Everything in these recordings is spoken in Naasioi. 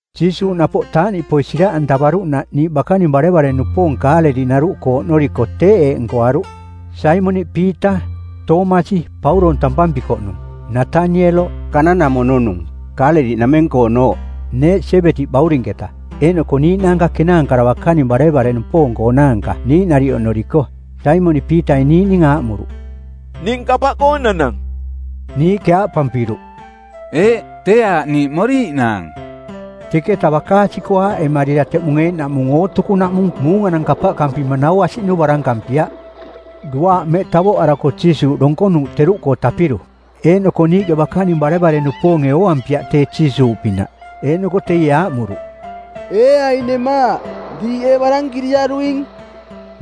Jiisuuꞌ napoꞌ taaꞌniꞌpoi siraꞌantavaruꞌnaꞌ niiꞌ bakaning barevare-nupoong Kaaleliꞌnaruꞌkoo oꞌnoriko teeꞌ eeꞌ nkoaruꞌ: Saimoniꞌ Piita, Toomasi (Pauroong tampampikoꞌnung), Natanieloꞌ (Kana-namono-nung, Kaaleliꞌnameng-koonooꞌ), neeꞌ Siebedi-baurinketa, eeꞌnoko niiꞌnaanka kenaankara bakaning barevare-nupoong-koonaanka niiꞌ nariꞌ oꞌnoriko. Saimoniꞌ Piitai niiꞌning aaꞌmuruꞌ, “Ning kapaꞌkoo nanang.” Niiꞌke aaꞌpampiruꞌ, “Eeꞌ, tee aaꞌ niiꞌ moriiꞌnaang.” Teketa bakaasi-koo aaꞌemarira teꞌmung eeꞌnaꞌmung ootukunaꞌmung muunganang kapaꞌkampima nau asiꞌnu barankampiaꞌ. Duaaꞌ mmeꞌ tavoꞌarako Jiisuuꞌ donkonuuꞌ teruꞌkoo tapiru. Eeꞌnoko niiꞌke bakaning barevare-nupoonge ooampiaꞌ tee Jiisuuꞌpinaꞌ. Eeꞌnoko teie aaꞌmuruꞌ, “Ee aing nemaaꞌ, diiꞌ ee barankiriaruing?”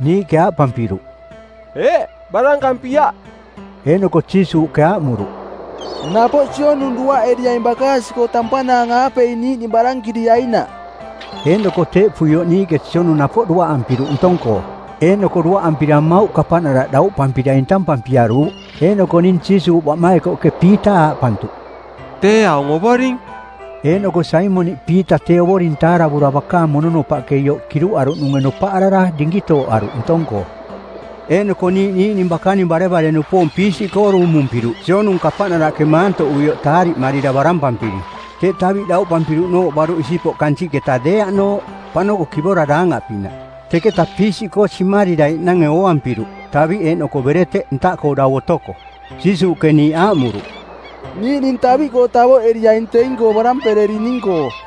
Niiꞌke aaꞌpampiruꞌ, “Eeꞌ, barankampiaꞌ.” Eeꞌnoko Jiisuuꞌke aaꞌmuruꞌ, “Napoꞌ sionung duaꞌeriaing bakaasi-koo tampanaang-aapei niiꞌning barankiriainaꞌ.” Eeꞌnoko teeꞌpuioꞌ niiꞌke sionung napoꞌ duaꞌampiruꞌ ntong-koo, eeꞌnoko duaꞌampira mmauꞌ kapaꞌnaraꞌ dauꞌpampira intampampiaruuꞌ. Eeꞌnoko ning Jiisuuꞌ baꞌmaikoꞌke Piita aaꞌpantuꞌ, “Tee aung Ovoring.” Eeꞌnoko Saimoniꞌ Piita tee Ovoring taaravura bakaang mononopaꞌke ioꞌ kiruꞌaruꞌnunge nopaꞌarara dinkitooꞌaruꞌ ntong-koo. Eeꞌnoko niiꞌ niiꞌning bakaning barevare-nupoong piisiꞌkoo duumumpiruꞌ sionung kapaꞌnaraꞌke maantoꞌuioꞌ taariꞌmarira barampampiri; teꞌ taviꞌ dauꞌpampiruꞌnooꞌ baruꞌ isipoꞌ kansiꞌketa deeaꞌnooꞌ, paꞌnokoꞌ kivora daangaꞌpinaꞌ. Teketa piisiꞌkoo simariraiꞌnange ooampiruꞌ, taviꞌ eeꞌnoko bereteꞌ ntaꞌkoo dau otoko. Jiisuuꞌke niiꞌ aaꞌmuruꞌ, “Niiꞌning taviꞌkoo tavoꞌeriaing teing-koo barampererining-koo.”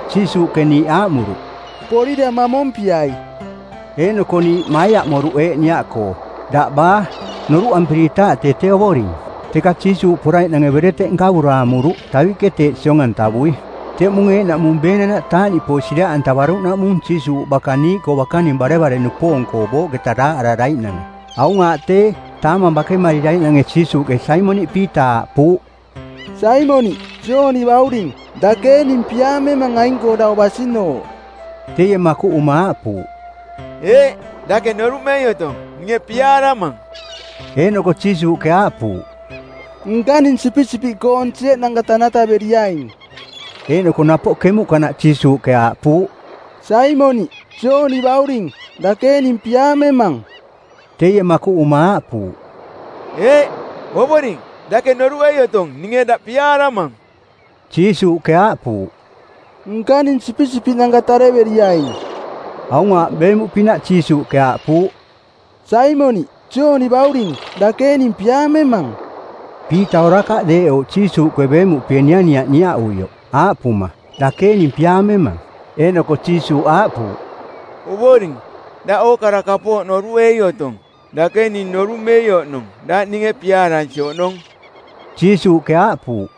Jiisuuꞌke niiꞌ aaꞌmuruꞌ, “Porira mamompiai.” Eeꞌnoko niiꞌ maiaꞌmoruꞌ eeꞌ niaꞌkoo “Daꞌ baa?” noruꞌampiritaaꞌ tee tee Ovoring. Teka Jiisuuꞌ poraiꞌnange bereteꞌ nkavura amuruꞌ, taviꞌke teeꞌ siong-antavui. Teꞌmung eeꞌnaꞌmung beenanaꞌ taaꞌniꞌpoi siraꞌantavaruꞌnaꞌmung Jiisuuꞌ baka niiꞌkoo bakaning barevare-nupoong-koo booꞌketa daaꞌararaiꞌnange. Aung aaꞌ tee, taamang bakemariraiꞌnange Jiisuuꞌke Saimoniꞌ Piita aaꞌpuuꞌ, “Saimoniꞌ, Jooni bauring, dake ee ning piaamemang aing-koo dau basinooꞌ?” Teie makuꞌuma aaꞌpuuꞌ, “Eeꞌ. Dake noruꞌmei otong, ninge piaaramang.” Eeꞌnoko Jiisuuꞌke aaꞌpuuꞌ, “Nkaning sipisipiꞌkoong sieꞌnanka tanataveriaing.” Eeꞌnoko napoꞌ kemuꞌkanaꞌ Jiisuuꞌke aaꞌpuuꞌ, “Saimoniꞌ, Jooni bauring, dake ee ning piaamemang?” Teie makuꞌuma aaꞌpuuꞌ, “Eeꞌ, Ovoring, dake noruꞌei otong ninge daꞌ piaaramang.” Jiisuuꞌke aaꞌpuuꞌ, “Nkaning sipisipiꞌnanka tareveriaing.” Aung aaꞌ beemuꞌpinaꞌ Jiisuuꞌke aaꞌpuuꞌ, “Saimoniꞌ, Jooni bauring, dake ee ning piaamemang?” Piita orakaꞌ deeꞌouꞌ Jiisuuꞌke beemuꞌpie nianiaꞌ niaꞌuioꞌ, aaꞌpuma, “Dake ee ning piaamemang?” Eeꞌnoko Jiisuuꞌ aaꞌpuuꞌ, “Ovoring, daꞌ ookara kapooꞌ noruꞌei otong. Dake ning noruꞌmei oꞌnong daꞌ ninge piaaransi oꞌnong.” Jiisuuꞌke aaꞌpuuꞌ,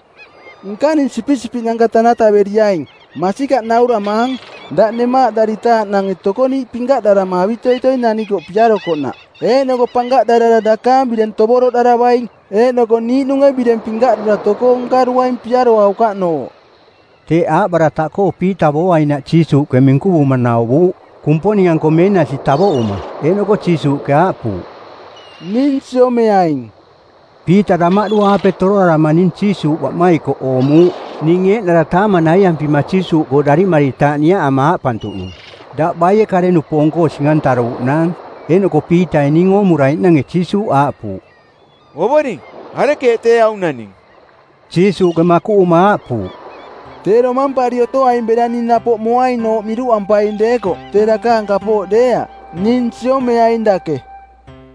“Nkaning sipisipiꞌnanka tanataveriaing. Masikaꞌ nauramaang, daꞌ nemaaꞌdaritaaꞌnange tokoniiꞌ pinkaꞌdarama avitoitoi nanikoꞌ piarokoꞌnaꞌ, eeꞌnoko pankaꞌdarara dakaang bireng tovoroꞌdaravaing, eeꞌnoko niiꞌnunge bireng pinkaꞌdura tokoo nkaruaing piaroaukaꞌnooꞌ.” Teeꞌ aaꞌbarataꞌkoo Piita booainaꞌ Jiisuuꞌke minkuvuma nauvuuꞌ, Kumponing-anko meenasi tavoꞌuma. Eeꞌnoko Jiisuuꞌke aaꞌpuuꞌ, “Ning siomeaing.” Piita damaꞌdu-aape toroarama ning Jiisuuꞌ baꞌmaikoꞌ oomuuꞌ, ning eeꞌnara taamang naiampima Jiisuuꞌkoo darimaritaaꞌ niaꞌama aaꞌpantuꞌnung, “Daꞌ baie kare-nupoong-koo sing-antaruuꞌnaang?” Eeꞌnoko Piitai ning oomuraiꞌnange Jiisuuꞌ aaꞌpuuꞌ, “Ovoring, arekeeꞌ tee aung naning?” Jiisuuꞌke makuꞌuma aaꞌpuuꞌ, “Tee domampari otoaing bera ning napoꞌ moainooꞌ miruꞌampaing deekoꞌ tee dakaang kapooꞌ deeaꞌ. Ning siomeaing dake.”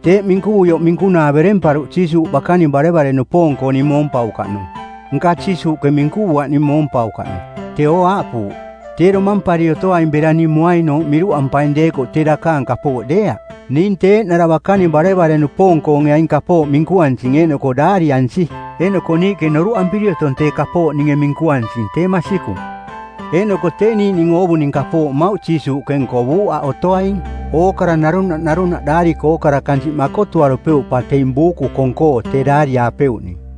Teeꞌ minkuvuioꞌ minkunaa beremparuꞌ Jiisuuꞌ bakaning barevare-nupoong-koo ning moompaukaꞌnung. Nka Jiisuuꞌke minkuvuaꞌ ning moompaukaꞌnung. Teeo aaꞌpuuꞌ, “Tee domampari otoaing bera ning moainooꞌ miruꞌampaing deekoꞌ tee dakaang kapooꞌ deeaꞌ.” Ning tee eeꞌnara bakaning barevare-nupoong-koonge aing kapooꞌ minkuansing eeꞌnoko daariansi. Eeꞌnoko niiꞌke noruꞌampiri otong tee kapooꞌ ninge minkuansing tee masikung. Eeꞌnoko tee niiꞌning oovuning kapooꞌ mmauꞌ Jiisuuꞌke nkovuuꞌ aꞌ otoaing. Ookara narunaꞌ narunaꞌ daari-koo ookara kansiꞌ makotuarupeuꞌ pa teing buuku kong-koo tee daariaapeuꞌning.